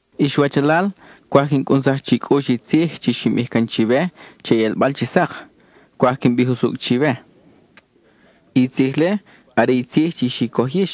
Ix wachalal, cwaj quin cʼunsaj chi cʼux i tzij chi xin bij can chiwe che i ʼelbal chi sak; cwaj quin bij usucʼ chiwe. I tzij-le are i tzij chi xi coj yix,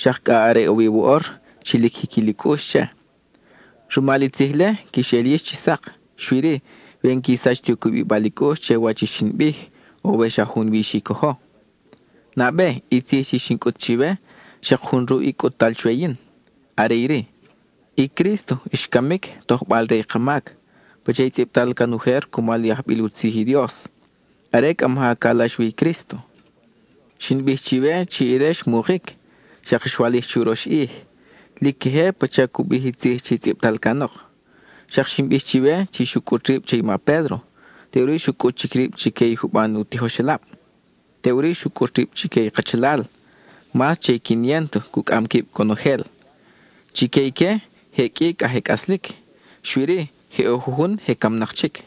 xak cʼa are ʼo wi woʼor chi lic jiquil i cʼux che. Rumal i tzij-le, quix el yix chi sak, xui-ri, we n-qui sach ti u cubibal i cʼux che wach i xin bij, o we xa junwi xi cojo. Nabe, i tzij chi xin cʼut chiwe, xak jun ruʼ i cʼut-tal chwe yin; are iri: i Crísto xcamic tojbal-re i ka mac, pacha i tzʼibtal can ujer cumal i ajbil u tzij i Dios (are cʼa maja calax wi i Crísto). Xin bij chiwe chi ire xmukic, xak xwalij churox ʼij, lic queje pacha cu bij i tzij chi tzʼibtal canok. Xak xin bij chiwe chi xu cʼut rib che i ma Pédro, teʼuri xu cʼut chic rib chique i juban u tijoxelab. Teʼuri xu cʼut rib chique i kachalal, mas che i quiniénto cucʼam quib conojel. Chique ique je qʼui cʼa je cʼaslic, xui-ri je ʼo jujun je camnak chic.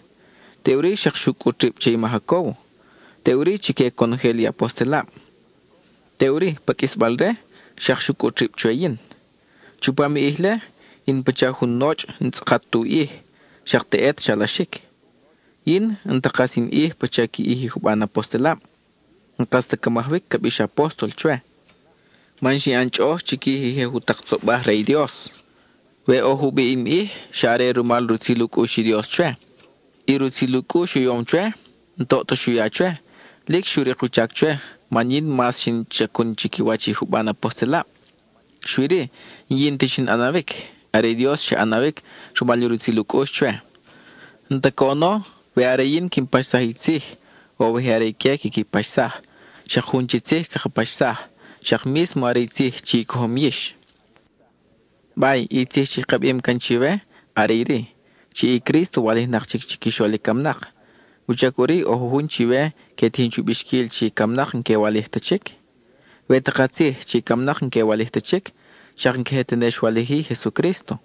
Teʼuri xak xu cʼut rib che i ma Jacóbo, y teʼuri chique conojel i apostelab. Teʼuri, pa qʼuisbal re, xak xu cʼut rib chwe yin. Chupam i ʼij-le, in pacha jun nochʼ n-tzʼakat tu ʼij, xak teʼet xalaxic. Yin, n-ta kas in ʼij pacha qui ʼij i juban apostelab; n-kas ta ca majawic ca bix “apóstol” chwe, man xin ʼan chʼoʼoj chiquij i je jutak tzobaj re i Dios. We ʼo jubiʼ in ʼij, xa are rumal i rutzil u cʼux i Dios chwe. I rutzil u cʼux u yom chwe, n-toʼ ta xu ya chwe, lic xu rik u chac chwe man yin mas xin chacun chiquiwach i juban apostelab. Xui-ri, n-yin ta xin ʼanawic, are i Dios xa ʼanawic rumal i rutzil u cʼux chwe. N-ta coʼono we are yin quin paxsaj i tzij, o we je are ique quiqui paxsaj, xak jun chi tzij caka paxsaj, xak mísmo are i tzij chi i cojom yix. Bay, i tzij chi ka bim can chiwe are iri: chi i Crísto walijnak chic chiquixol i camnak, ¿wuchac ʼuri ʼo jujun chiwe que tijin chu bixquil chi i camnak n-que walij ta chic? We ta katzij chi i camnak n-que walij ta chic, xak n-queje tene xwalij-i i Jesucrísto.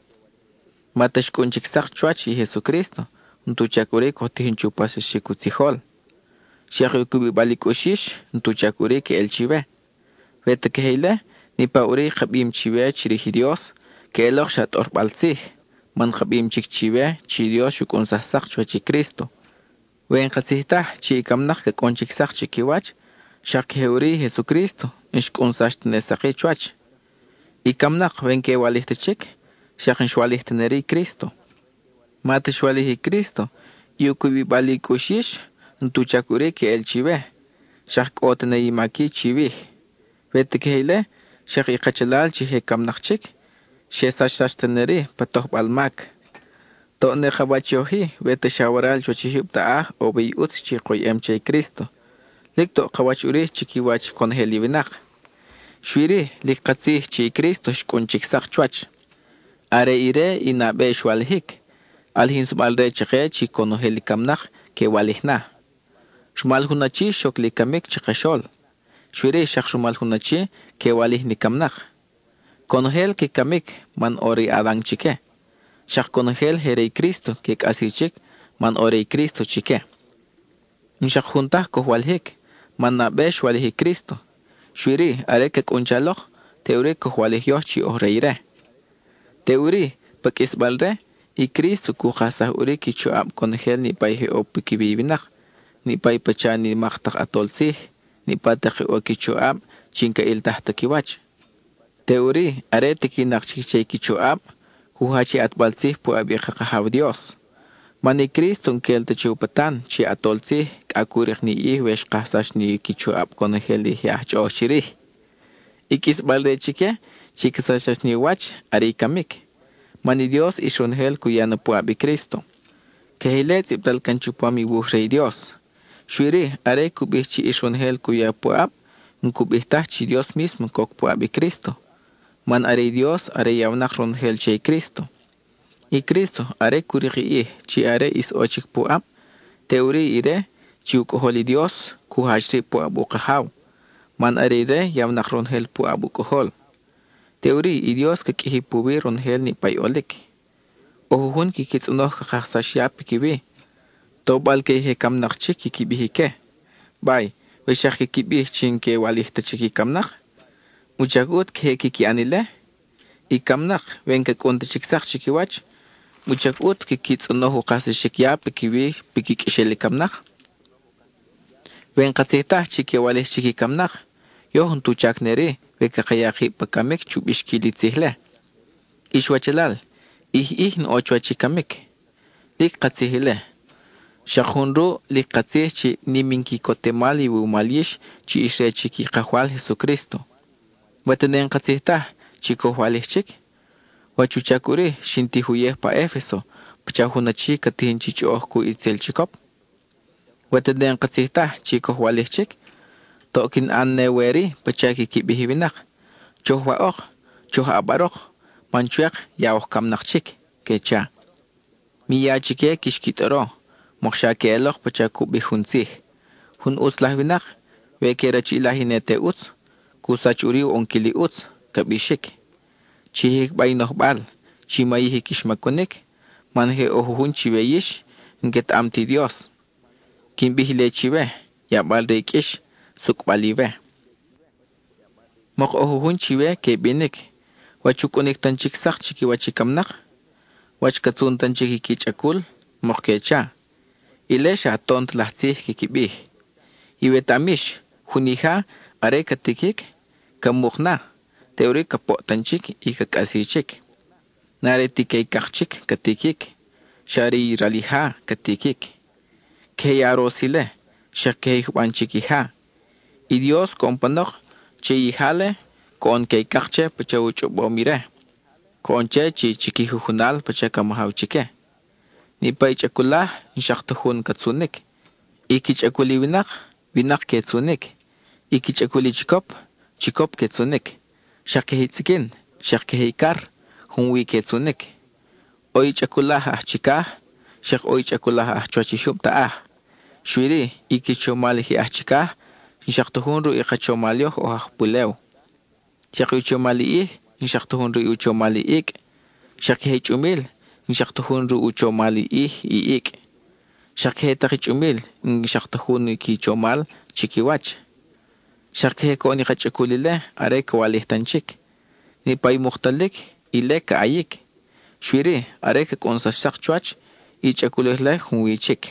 Ma ta xcʼun chic sak chuwach i Jesucrísto, n-tu chac ʼuri coj tijin chu paxsaxic u tzijol; xak i u cubibal i cʼux yix, n-tu chac ʼuri queʼel chiwe. We ta queje ile, niʼpa ʼuri i ka bim chiwe chirij i Dios, queʼelok xa tʼorbal tzij, man ka bim chic chiwe chi Dios xu cʼunsaj sak chuwach i Crísto. We n-katzij taj chi i camnak ca cʼunsax chic sak chiquiwach, xak queje ʼuri i Jesucrísto, n-xcʼunsax tene sak-i chuwach. I camnak, we n-que walij ta chic, xak n-xwalij tene-ri i Crísto. Ma ta xwalij i Crísto, i u cubibal i cʼux yix, n-tu chac ʼuri queʼel chiwe, xak cʼo tene i mac-i chiwij. We ta queje ile, xak i kachalal chi je camnak chic, xe sachsax tene-ri pa tojbal mac. Toʼ ne ka wach yoj-i we ta xa waral chuwach i jyub taʼaj ʼo wi i ʼutz chi koyʼem che i Crísto; lic toʼ ka wach ʼuri chiquiwach conojel i winak. Xui-ri, lic katzij chi i Crísto xcʼun chic sak chuwach; are ire i nabe xwalijic, ʼalijinsabal-re chake chi conojel i camnak que walij na. Rumal jun achi xoc li camic chakaxol; xui-ri xak rumal jun achi que walij ni camnak. Conojel que camic man ʼo re i Adan chique; xak conojel (i je re i Crísto) que cʼasi chic man ʼo re i Crísto chique. N-xak jun taj coj walijic, man nabe xwalij i Crísto; xui-ri are ca cʼun chalok, teʼuri coj walij yoj chi oj re ire. Teʼuri pa qʼuisbal re, i Crísto cu kajsaj ʼuri qui choʼab conojel niʼpa i je ʼo piquiwi i winak, niʼpa i pacha nimak tak ʼatol tzij, niʼpa tak i ʼo qui choʼab chi n-ca ʼiltaj ta qui wach. Teʼuri are tiquinak chic che i qui choʼab, cu jach i ʼatbal tzij puʼab i ka Kajaw Dios. Man i Crísto n-quel ta che u patan chi ʼatol tzij cʼa cu rik ni ʼij we xkajsax ni qui choʼab conojel i je aj chʼoʼoj chirij. I qʼuisbal-re chique chi ca sachsax ni u wach, are i camic. Man i Dios, ʼis ronojel cu ya na puʼab i Crísto; queje ile tzʼibtal can chupam i wuj re i Dios; xui-ri are cu bij chi ʼis ronojel cu ya puʼab, n-cu bij taj chi Dios mísmo coc puʼab i Crísto, man are i Dios are yawnak ronojel che i Crísto. I Crísto, are cu rik i ʼij chi are ʼis ʼo chic puʼab, teʼuri ire, chi u Cʼojol i Dios, cu jach rib puʼab u Kajaw, man are ire yawnak ronojel puʼab u Cʼojol. Teʼuri i Dios ca qʼuiji puwi ronojel i niʼpa i ʼolic. ʼO jujun quiqui tzʼonoj ca kajsax ya piquiwi, tobal-que i je camnak chic quiqui bij ique. Bay, we xak quiqui bij chi n-que walij ta chic i camnak, ¿wuchac ʼut queje quiqui ʼan ile? I camnak, we n-ca cʼun ta chic sak chiquiwach, ¿wuchac ʼut quiqui tzʼonoj u kajsaxic ya piquiwi piqui qʼuexel i camnak? We n-katzij taj chi que walij chic i camnak, yoj n-tu chac ne-ri we caka ya kib pa camic chu bixquil i tzij-le. Ix wachalal, ʼij ʼij in ʼo chuwach i camic. Lic katzij ile, xak jun ruʼ lic katzij chi nim in quicotemal iwumal yix chi ix re chic i Kajwal Jesucrísto. We tene n-katzij taj chi coj walij chic, ¿wach u chac ʼuri xin tij uyej pa Efeso, pacha jun achi ca tijin chi chʼoʼoj cuʼ itzel chicop? We tene n-katzij taj chi coj walij chic, toʼ quin ʼan ne we-ri pacha quiqui bij i winak: “Choj waʼok, choj ʼabarok, man chwek ya oj camnak chic,” que cha. Mi ya chique quix qui tʼoro, mokxa queʼelok pacha cu bij jun tzij: “Jun ʼutz laj winak, we que rachiʼilaj i ne te ʼutz, cu sach ʼuri u ʼonquil i ʼutz,” ca bixic. Chi jicba i nojbal; chi mayij i quix macunic, man je ʼo jujun chiwe yix n-quetaʼam ti Dios; quin bij ile chiwe, yabal re i qʼuix, sucʼbal iwe. Mok ʼo jujun chiwe que binic, ¿wach u cʼunic tan chic sak chiquiwach i camnak? ¿Wach ca tzun tan chic i qui chʼacul? mok que cha. Ile xa tont laj tzij quiqui bij. Iwetaʼam yix, jun ija, are ca tiquic, ca muk na, teʼuri ca poʼ tan chic y ca cʼasi chic. N-are ti queycak chic ca tiquic, xa are i ral ija ca tiquic; queje i aros ile, xak queje i juban chic ija. I Dios coʼon panok, che i ija-le, coʼon queycak che pacha u chʼobom ire; coʼon che chi qui jujunal pacha ca majaw chique. Niʼpa i chʼaculaj, n-xak ta jun ca tzunic; i qui chʼacul i winak, winak que tzunic; i qui chʼacul i chicop, chicop que tzunic; xak queje i tzʼiquin, xak queje i car, junwi que tzunic. ʼO i chʼaculaj aj chicaj, xak ʼo i chʼaculaj aj chuwach i jyub taʼaj. Xui-ri, i qui chomal i je aj chicaj, n-xak ta jun ruʼ i ka chomal yoj oj aj pulew. Xak i u chomal i ʼij, n-xak ta jun ruʼ i u chomal i icʼ, xak queje i chʼumil, n-xak ta jun ruʼ u chomal i ʼij, i icʼ. Xak queje tak i chʼumil, n-xak ta jun i qui chomal chiquiwach. Xak queje coʼon i ka chʼacul ile are ca walij tan chic. Niʼpa i muktalic, ile ca ʼayic; xui-ri are ca cʼunsax sak chuwach, i chʼaculaj-le junwi chic,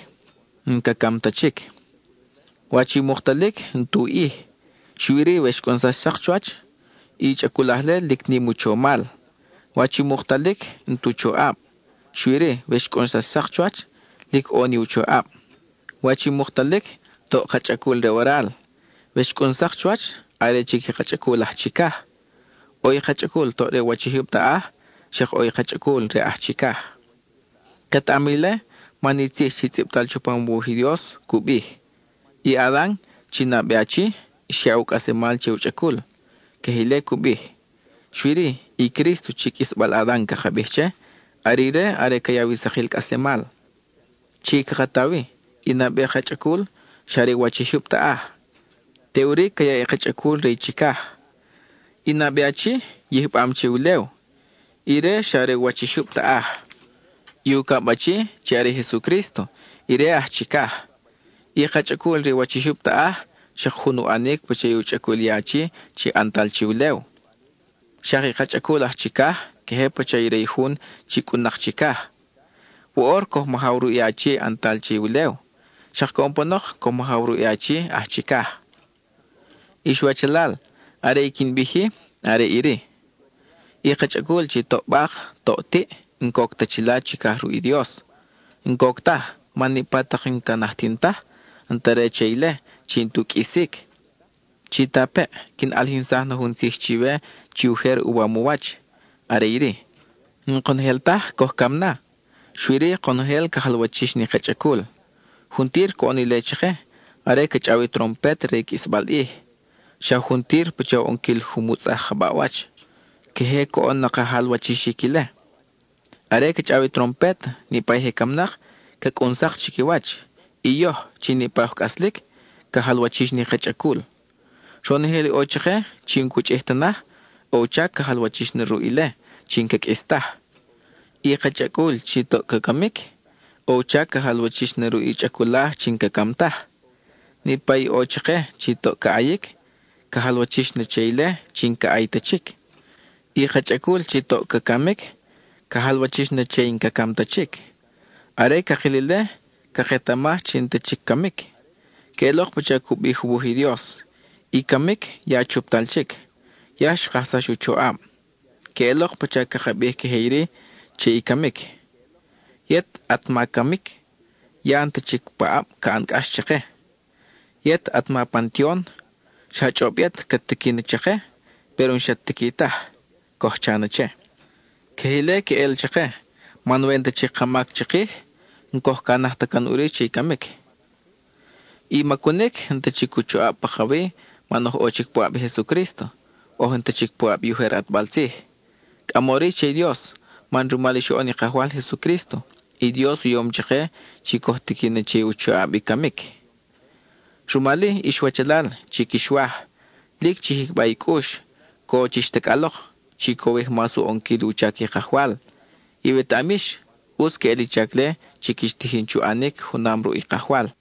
n-ca cam ta chic. Wach i muktalic, n-tu ʼij, xui-ri we xcʼunsax sak chuwach, i chʼaculaj-le lic nim u chomal. Wach i muktalic, n-tu choʼab, xui-ri we xcʼunsax sak chuwach, lic ʼo ni u choʼab. Wach i muktalic, toʼ ka chʼacul re waral; we xcʼun sak chuwach, are chic i ka chʼacul aj chicaj. ʼO i ka chʼacul toʼ re u wach i jyub taʼaj, xak ʼo i ka chʼacul re aj chicaj. Ketaʼam ile, man i tzij chi tzʼibtal chupam u wuj i Dios cu bij: “I Adan, chi nabe achi, xyaʼ u cʼaslemal che u chʼacul,” queje ile cu bij. Xui-ri, i Crísto chi qʼuisbal Adan caka bij che, are ire are ca yaw i sakil cʼaslemal. Chi caka ta wi, i nabe ka chʼacul, xa re u wach i jyub taʼaj; teʼuri ca yaʼ i ka chʼacul re i chicaj. I nabe achi, yijbam che ulew, ire xa re u wach i jyub taʼaj; i ucab achi, chi are i Jesucrísto, ire aj chicaj. I ka chʼacul re u wach i jyub taʼaj, xak jun u ʼanic pacha i u chʼacul i achi chi ʼantal che ulew; xak i ka chʼacul aj chicaj queje pacha re i jun chi cʼun-nak chicaj. Woʼor coj majaw ruʼ i achi ʼantal che ulew; xak coʼon panok coj majaw ruʼ i achi aj chicaj. Ix wachalal, are i quin bij-i are iri: i ka chʼacul chi toʼ bak, toʼ tiʼ, n-coc ta chila chicaj ruʼ i Dios. N-coc taj, man niʼpa tak i n-ca najtin taj, n-ta re che ile chi n-tu qʼuisic. Chitapeʼ, quin ʼalijinsaj na jun tzij chiwe chi ujer uwam u wach. Are iri: n-konojel taj coj cam na, xui-ri konojel ca jalwachix ni ka chʼacul. Juntir coʼon ile chake, are ca chʼaw i trompet re i qʼuisbal ʼij; xa juntir pacha u ʼonquil jumutzʼaj ka baʼwach, queje coʼon ka jalwachixic ile. Are ca chʼaw ni trompet, niʼpa i je camnak, ca cʼun sak chiquiwach, y yoj, chi niʼpa i oj cʼaslic, ca jalwachix ni ka chʼacul. Ronojel i ʼo chake chi n-cu chʼij ta naj, ʼo u chac ca jalwachix na ruʼ ile chi n-ca qʼuis taj. I ka chʼacul chi toʼ ca camic, ʼo u chac ca jalwachix na ruʼ i chʼaculaj chi n-ca cam taj. Niʼpa i ʼo chake chi toʼ ca ʼayic, ca jalwachix na che ile chi n-ca ʼay ta chic; i ka chʼacul chi toʼ ca camic, ca jalwachix na che i n-ca cam ta chic. Are cakil ile, caketamaj chi n-ta chic camic; queʼelok pacha cu bij u wuj i Dios: “I camic ya chuptal chic; ya xkajsax u choʼab.” (Queʼelok pacha caka bij queje iri che i camic): “Yet, at ma Camic, ¡ya n-ta chic paʼab ca ʼan cʼax chake! Yet, at ma Pantion, xa chʼob yet cat tiqui na chake, péro n-xat tiqui taj,” coj cha na che. Queje ile queʼel chake, man we n-ta chic ka mac chikij, n-coj canaj ta can ʼuri che i camic. I macunic, n-ta chic u choʼab pakawi man oj ʼo chic puʼab i Jesucrísto, oj n-ta chic puʼab i ujer ʼatbal tzij. Cʼamori che i Dios, man rumal i xoʼon i Kajwal Jesucrísto, i Dios u yom chake chi coj tiqui na che i u choʼab i camic. Rumal-i, ix wachalal chi quix waj, lic chi jicba i cʼux; co chix tacʼalok. Chi cowij mas u ʼonquil i u chac i Kajwal. Iwetaʼam yix, ʼutz queʼel i chac-le chi quix tijin chu ʼanic junam ruʼ i Kajwal.